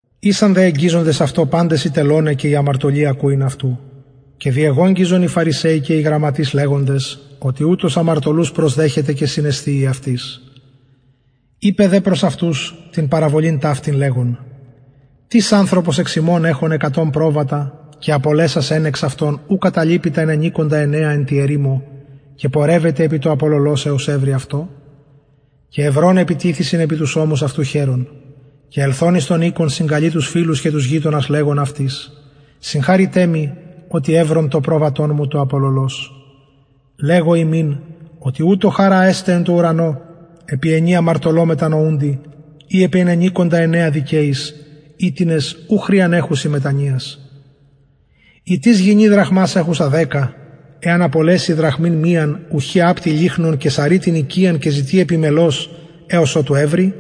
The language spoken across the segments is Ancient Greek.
ησαν δε εγγιζοντες αυτω παντες οι τελωναι και οι αμαρτωλοι ακουειν αυτου και διεγογγυζον οι φαρισαιοι και οι γραμματεις λεγοντες οτι ουτος αμαρτωλους προσδεχεται και συνεσθιει αυτοις ειπεν δε προς αυτους την παραβολην ταυτην λεγων τις ανθρωπος εξ υμων εχων εκατον προβατα και απολεσας εν εξ αυτων ου καταλειπει τα ενενηκοντα εννεα εν τη ερημω και πορευεται επι το απολωλος εως ευρη αυτο και ευρων επιτιθησιν επι τους ωμους εαυτου χαιρων και ελθων εις τον οικον συγκαλει τους φιλους και τους γειτονας λεγων αυτοις συγχαρητε μοι οτι ευρον το προβατον μου το απολωλος λεγω υμιν οτι ουτως χαρα εσται εν τω ουρανω επι ενι αμαρτωλω μετανοουντι η επι ενενηκοντα εννεα δικαιοις οιτινες ου χρειαν εχουσιν μετανοιας η τις γυνη δραχμας εχουσα δεκα εαν απολεση δραχμην μιαν ουχι απτει λυχνον και σαροι την οικιαν και ζητει επιμελως εως οτου ευρη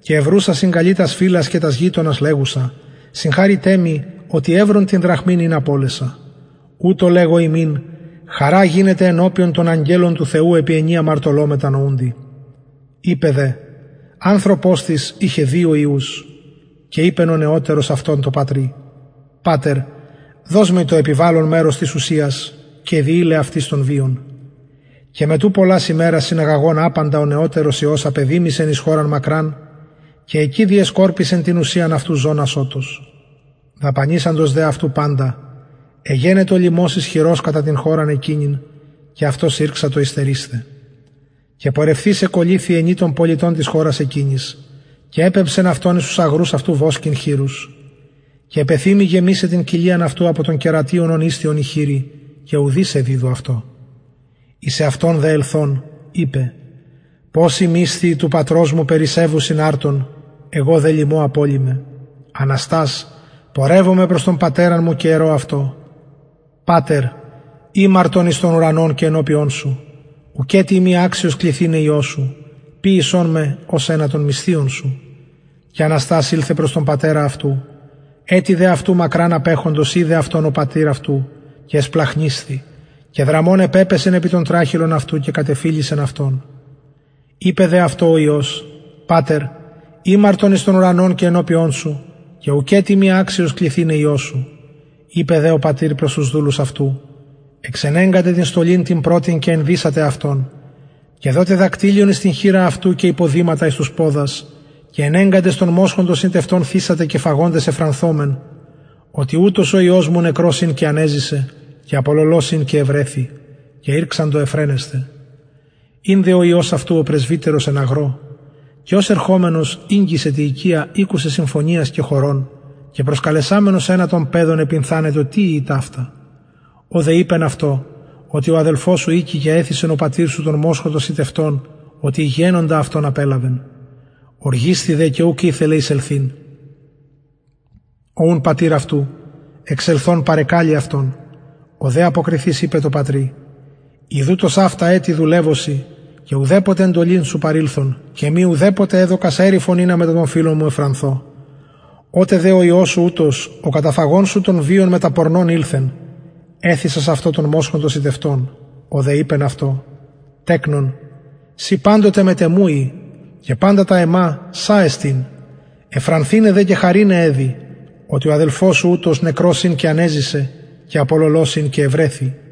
και ευρουσα συγκαλειται τας φιλας και τας γειτονας λεγουσα συγχαρητε μοι οτι ευρον την δραχμην ην απωλεσα ουτως λεγω υμιν χαρα γινεται ενωπιον των αγγελων του θεου επι ενι αμαρτωλω μετανοουντι ειπεν δε ανθρωπος τις ειχεν δυο υιους και ειπεν ο νεωτερος αυτων τω πατρι πατερ δος μοι το επιβαλλον μερος της ουσιας και διειλεν αυτοις τον βιον και μετ ου πολλας ημερας συναγαγων απαντα ο νεωτερος υιος απεδημησεν εις χωραν μακραν και εκει διεσκορπισεν την ουσιαν αυτου ζων ασωτως δαπανησαντος δε αυτου παντα εγενετο λιμος ισχυρος κατα την χωραν εκεινην και αυτος ηρξατο υστερεισθαι και πορευθεις εκολληθη ενι των πολιτων της χωρας εκεινης και επεμψεν αυτον εις τους αγρους αυτου βοσκειν χοιρους και επεθυμει γεμισαι την κοιλιαν αυτου απο των κερατιων ων ησθιον οι χοιροι και ουδεις εδιδου αυτω εις εαυτον δε ελθων ειπεν ποσοι μισθιοι του πατρος μου περισσευουσιν αρτων εγω δε λιμω απολλυμαι αναστας πορευσομαι προς τον πατερα μου και ερω αυτω πατερ ημαρτον εις τον ουρανον και ενωπιον σου και ουκετι ειμι αξιος κληθηναι υιος σου ποιησον με ως ενα των μισθιων σου και αναστας ηλθεν προς τον πατερα αυτου ετι δε αυτου μακραν απεχοντος ειδεν αυτον ο πατηρ αυτου και εσπλαγχνισθη και δραμων επεπεσεν επι τον τραχηλον αυτου και κατεφιλησεν αυτον ειπεν δε αυτω ο υιος πατερ ημαρτον εις τον ουρανον και ενωπιον σου και ουκετι ειμι αξιος κληθηναι υιος σου ειπεν δε ο πατηρ προς τους δουλους αυτου εξενεγκατε την στολην την πρωτην και ενδυσατε αυτον και δοτε δακτυλιον εις την χειρα αυτου και υποδηματα εις τους ποδας και ενεγκαντες τον μοσχον τον σιτευτον θυσατε και φαγοντες ευφρανθωμεν οτι ουτος ο υιος μου νεκρος ην και ανεζησεν και απολωλως ην και ευρεθη και ηρξαντο ευφραινεσθαι ην δε ο υιος αυτου ο πρεσβυτερος εν αγρω και ως ερχομενος ηγγισεν τη οικια ηκουσεν συμφωνιας και χορων και προσκαλεσαμενος ενα των παιδων επυνθανετο τι ειη ταυτα ο δε ειπεν αυτω οτι ο αδελφος σου ηκει και εθυσεν ο πατηρ σου τον μοσχον τον σιτευτον οτι υγιαινοντα αυτον απελαβεν ωργισθη δε και ουκ ηθελεν εισελθειν ο ουν πατηρ αυτου εξελθων παρεκαλει αυτον ο δε αποκριθεις ειπεν τω πατρι ιδου τοσαυτα ετη δουλευω σοι και ουδεποτε εντολην σου παρηλθον και εμοι ουδεποτε εδωκας εριφον ινα μετα των φιλων μου ευφρανθω οτε δε ο υιος σου ουτος ο καταφαγων σου τον βιον μετα πορνων ηλθεν εθυσας αυτω τον μοσχον τον σιτευτον ο δε ειπεν αυτω τεκνον συ παντοτε μετ εμου ει και παντα τα εμα σα εστιν ευφρανθηναι δε και χαρηναι εδει οτι ο αδελφος σου ουτος νεκρος ην και ανεζησεν και απολωλως ην και ευρεθη